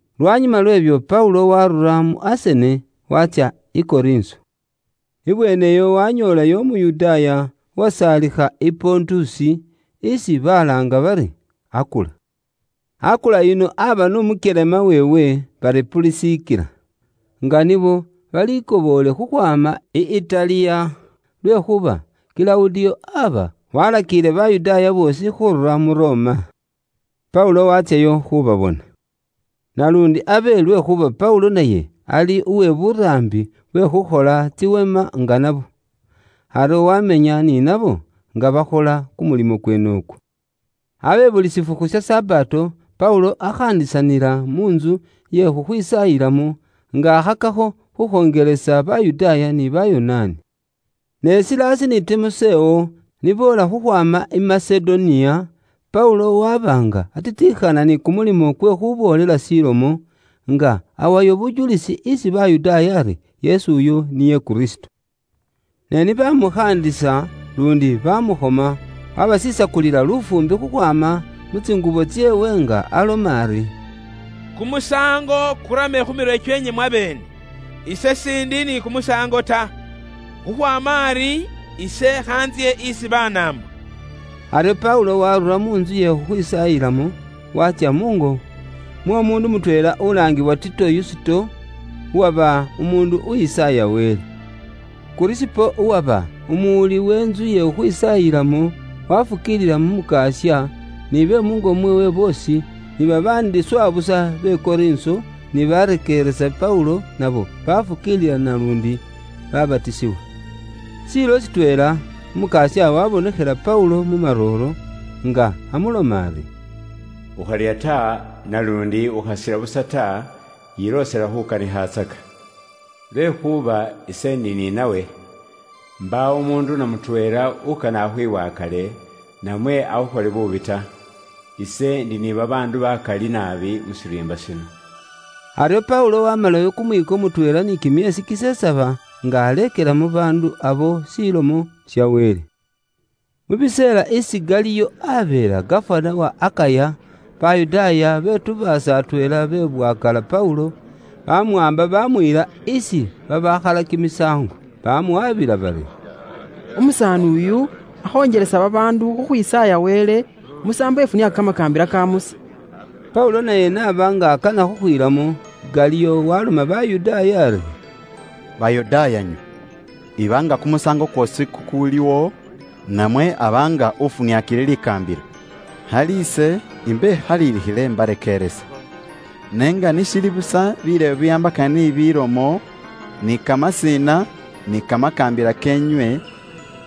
Lwanyuma lw'ebyo, Paulo waarura mu Asene, watsya i Korinso. Ibweene iyo wanyoolayo Umuyudaaya uwasaalikha i Pontusi isi balaanga bari Akula. Akula yuno aba n'umukyelema weewe bari Pulisikila, nga nibo balikoboole khukhwaama i Itali, lwekhuuba Kilawudiyo aba walakiile Bayudaaya boosi khurura mu Roma. Paulo watsyayo khubabona. Naluundi abe lwekhuuba Paulo naye ali uwe buraambi bwe khukhola tsiweema nga nabo. Aryo wamenya ni nabo nga bakhola kumulimo kweene ikwo. Abe buli shifukhu sha Sabato, Paulo akhaandisanila mu ntsu iye khukhwisaayilamo, nga akhakakho khukhonjelesa Bayudaaya ni Bayonaani. Ne Silasi ni Timosewo ni boola khukhwaama i Masedoniya, Paulo waba nga atitikhana ni kumulimo kwe khuboolela shilomo, nga awayo bujulisi isi Bayudaaya ari Yesu uyo niye Kristo. Ne ni bamukhaandisa luundi bamufwotsola, wabasisakulila lufuumbi khukhwaama mu tsingubo tseewe nga aloma ari, “Kumusaango kurame khu mirwe kyeenywe mwabeene! Ise siindi ni kumusaango ta. Khukhwaama ari, ise khantsye isi Banaambo.” Aryo Paulo waarura mu ntsu iye khukhwisaayilamo, watsya muungo mw'omuundu mutweela ulaangiwa Tito Yusito, uwaba umuundu uwisaaya Wele. Kurisipo uwaba umuraangilisi we ntsu ye khukhwisaayilamo, wafukiilila mu Mukasya, ni be muungo mweewe boosi, ni babaandi swa busa be Korinso ni barekeeresa Paulo nabo bafukiilila naluundi babatisibwa. Shiilo shitweela, Umukasya waabonekhela Paulo mu marooro, nga amuloma ari, “Ukharya ta, naluundi ukhasila busa ta, yiloosela khuukanikhatsaka. Lwekhuuba ise ndi ni nawe. Mbaawo umuundu na mutweela ukane akhwibwakale, namwe akhukhole buubi ta. Ise ndi ni babaandu bakali naabi mu shiriimba shino.” Aryo Paulo waamalayo kumwiiko mutweela ni kimyeesi kisesaba, nga aleekela mu baandu abo Ilomo ya Wele. Mu mbuka isi Galiyo aabeela gafana wa Akaya, Bayudaaya betubaasa atweela bebwakaala Paulo, baamuwaamba baamuyila isi bakhalila kimisaango. Baamuwaabila bari, “Umusaani uyu akhonjelesa babaandu khukhwisaaya Wele musaambo ifuniaaka kamakaambila ka Musa.” Paulo naye n'aba nga akana khukhwiilamo, Galiyo waloma Bayudaaya ari, “Bayudaaya, iba nga iliwo kumusaango kweesi Paulo akholile, namwe aba nga ufuniaakile likaambila, khali ise imbekhalilikhile inywe imbarekeeresa. Ne nga ni shili busa bireebo bibiwaambakana ni bilomo, ni kamasina ni kamakaambila keenywe,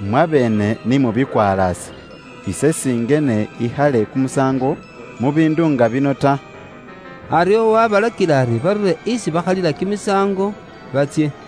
mwabeene ni mubikwalaase. Ise singene ikhale kumusaango mu biindu nga bino ta.” Aryo wabalakila ari barure isi bakhalila kimisaango batsye.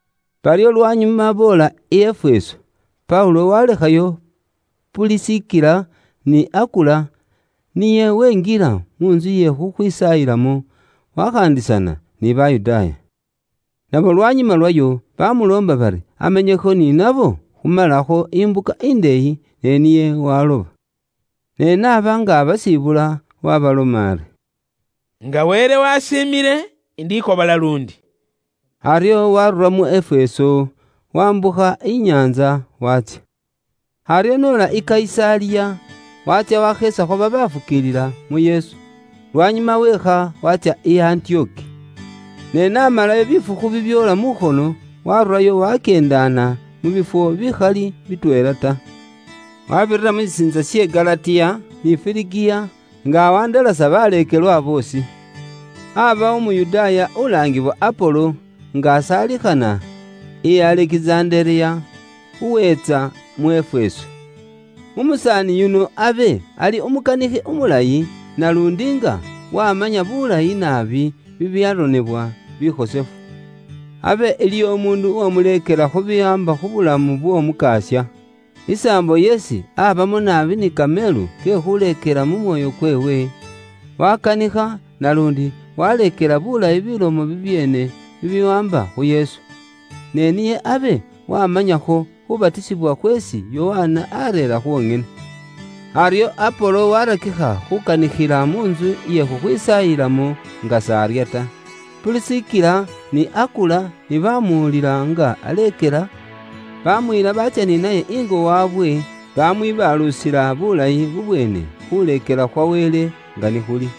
Baryo lwanyuma boola i Efeso, Paulo walekhayo Pulisikila ni Akula, niye wenjila mu ntsu iye khukhwisaayilamo, wakhaandisana ni Bayudaaya. Nabo lwanyuma lwayo bamuloomba bari amenyekho ni nabo khumalakho imbuka indeeyi, ne niye waloba. Ne n'aba nga abasibula, waabaloma ari, “Nga Wele wasiimile, indikobola luundi.” Aryo waarura mu Efeso, wambukha inyaantsa waatsya. Aryo n'ola i Kayisaliya, watsya washeesakho babafukiilila mu Yesu, lwanyuma weekha watsya i Antiyoki. Ne naamalayo bifukhu bibyoola mukhono, waarurayo wakyeendana mu bifwo bikhali bitweela ta. Wabirira mu shisiintsa she Galatiya, ni Firigiya, nga awandalasa baleekelwa boosi. Aabawo Umuyudaaya ulaangiwa Apolo, nga asaalikhana i Alekizandereya, uweetsa mu Efeso. Umusaani yuno abe ali umukanikhi umulayi, naluundi nga wamanya bulayi naabi bibyaronebwa bikhosefu. Abe iliwo umuundu uwamuleekela khu biwaamba khu bulamu bw'Omukasya. Isaambo yeesi abamo naabi ni kameelu ke khuleekela mu mwoyo kweewe, wakanikha, naluundi waleekela bulayi bilomo bibyeene bibiwaamba khu Yesu. Ne niye abe wamanyakho khubatisibwa khweesi Yokana areera khwonyene. Aryo Apolo waarakikha khuukanikhila mu ntsu iye khukhwisaayilamo nga s'arya ta. Pulisikila ni Akula ni baamuwulila nga aleekela, baamuyila baatsya ni naye ingo waabwe, bamwibaalusila bulayi bubweene khuleekela khwa Wele nga ni khuli.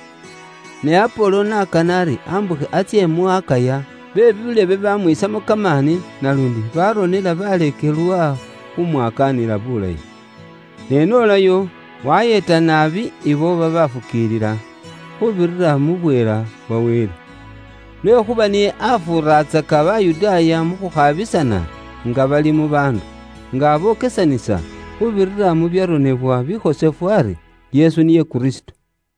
Ne Apolo n'akana ari ambukhe atsye mu Akaya, be buulebe bamwiisamo kamaani, naluundi baronela baleekelwa khumwakaanila bulayi. Ne n'olayo, wayeeta naabi ibo babafukiilila, khuubirira mu bweela bwa Wele. Lwekhuuba niye afuuratsaka Bayudaaya mu khukhabisana nga bali mu baandu, nga abokesanisa khuubirira mu byaronebwa bikhosefu ari, Yesu niye Kristo.